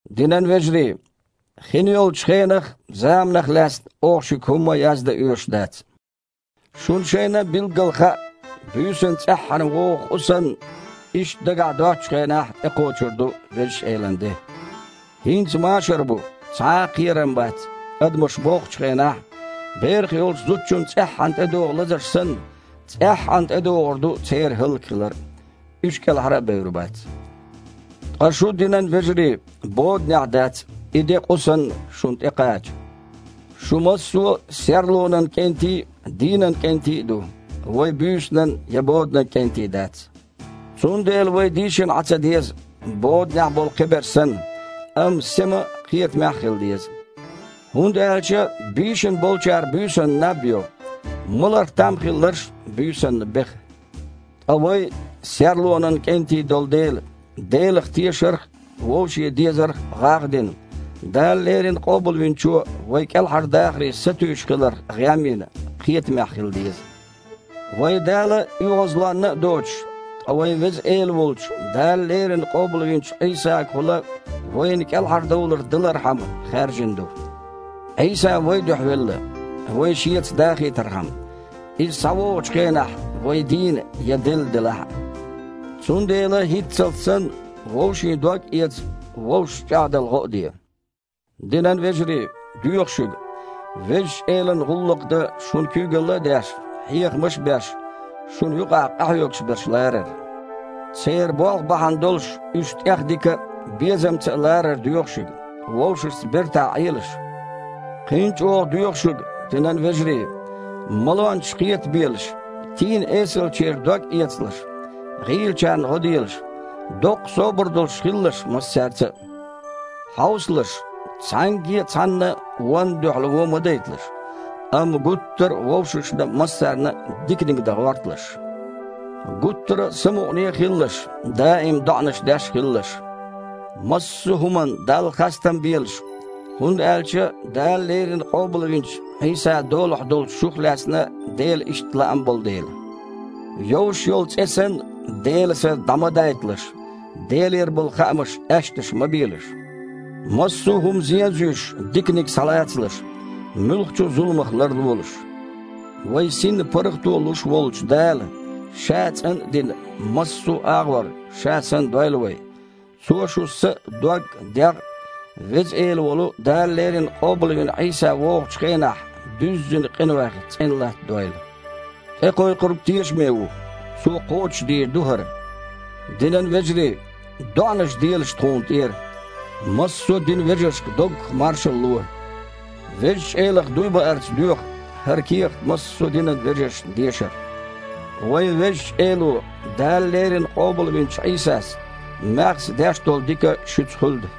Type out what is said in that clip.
Динан вежарий, хин йолчу хенах а, заманах а лаьцна оха шуьга хІумма а яздан оьшуш дац. Шуна шайна а билггала хаьа, буьйсанна цІеххьана вогІу къу санна, иштта дагахь доццучу хенахь тІекхочур ду Везачу Элан де. «ХІинца машар бу, цхьа а кхерам а бац» – адамаша боххучу хенахь, берах йолчу зудчунна цІеххьана тІедогІу лазарш санна, цІеххьана тІедогІур ду церан хІаллакьхилар а. Уьш кІелхьара а бевр бац. Ткъа шу, динан вежарий, боданехь дац, и де, къу санна, шуна тІекхача. Шу массо а серлонан кІентий а, дийнан кІентий а ду. Вай буьйсанан я боданан кІентий дац. Цундела вай дийшина Іан ца деза, боданехь болу кхиберш санна, амма сема а, кхетамехь а хила деза. ХІунда аьлча бийшина болчара буьйсанна наб йо, маларх там хилларш а буьйсанна беха. Ткъа вай серлонан кІентий долу дела, Делах тешарх а, вовшийн дезарх а гІагІ а дина, Дала леррина Къобалвинчо вай кІелхьардахаре сатуьйсуш хиларх гІем а йина, кхетамехь хила деза. Вай Дала оьгІазлонна а доцуш, ткъа вайн Веза Эла волчу Дала леррина къобалвинчу Іийсагахула вайна кІелхьардовлар далархьама хаьржина ду. Іийса вайн дуьхьа велла, вай Шеца дахийтархьама, Иза схьавогІучу хенахь вай дийна я делла делахь а. Цундела, хІинццалц санна, вовшийн дог а эца, вовшашна чІагІдала гІо а де. Динан вежарий, доьху шуьга, Везачу Элан гІуллакх дан шуна куьйгалла а деш, хьехамаш а беш, шуна юкъахь къахьоьгуш берш ларар. Церан болх бахьана долуш уьш тІехдика а, безамца а ларар доьху шуьга. Вовшашца бертахь Іелаш. Кхин а чІогІа доьху шуьга, динан вежарий, малончаш кхетабелаш, тийна-эсалчеран дог эцалаш, гІийлачарна гІо делаш, доккха собар долуш хилалаш массаьрца а. Хьовсалаш, цхьаьнгге а цхьанна а вонна дуьхьал вон ма дайталаш, амма гуттара а вовшашна а, массарна а диканиг дан гІорталаш. Гуттара а самукъане а хилалаш, даим а доІанаш деш а хилалаш, массо а хІуманна Далла хастам а белаш, хІунда аьлча Дала леррина къобалвинчу Іийсан долахь долчу шух лаьцна Делан иштта лаам болу дела. Йовш йолу цІе санна, Делан Са дІа ма дайталаш. Делера болу хаамаш аьшнаш ма белаш. Массо а хІума зен а зуьйш, диканиг схьалацалаш. Муьлххачу а зуламах ларлолаш. Вайн синна паргІато луш волчу Дала Ша цІан а дина, массо а агІор Ша санна дойла вай. Цо шун са а, дог а, дегІ а Веза Эла волу Дала леррина къобалвина Іийса вогІучу хенахь дуьззина къинойх цІена латтадойла. ТІекхойкхург тешаме ву. Цо кхочушдийр ду хІара. Динан вежарий! ДоІанаш делаш тхуна тІера. Массо а динан вежаршка доггах маршалла ло. Везачу Элах дуй баарца доьху хІара кехат массо а динан вежаршна дешар. Вайн Везачу Эло, Дала леррина къобалвинчу Іийсас, маьхза деш долу дика шуьца хуьлда.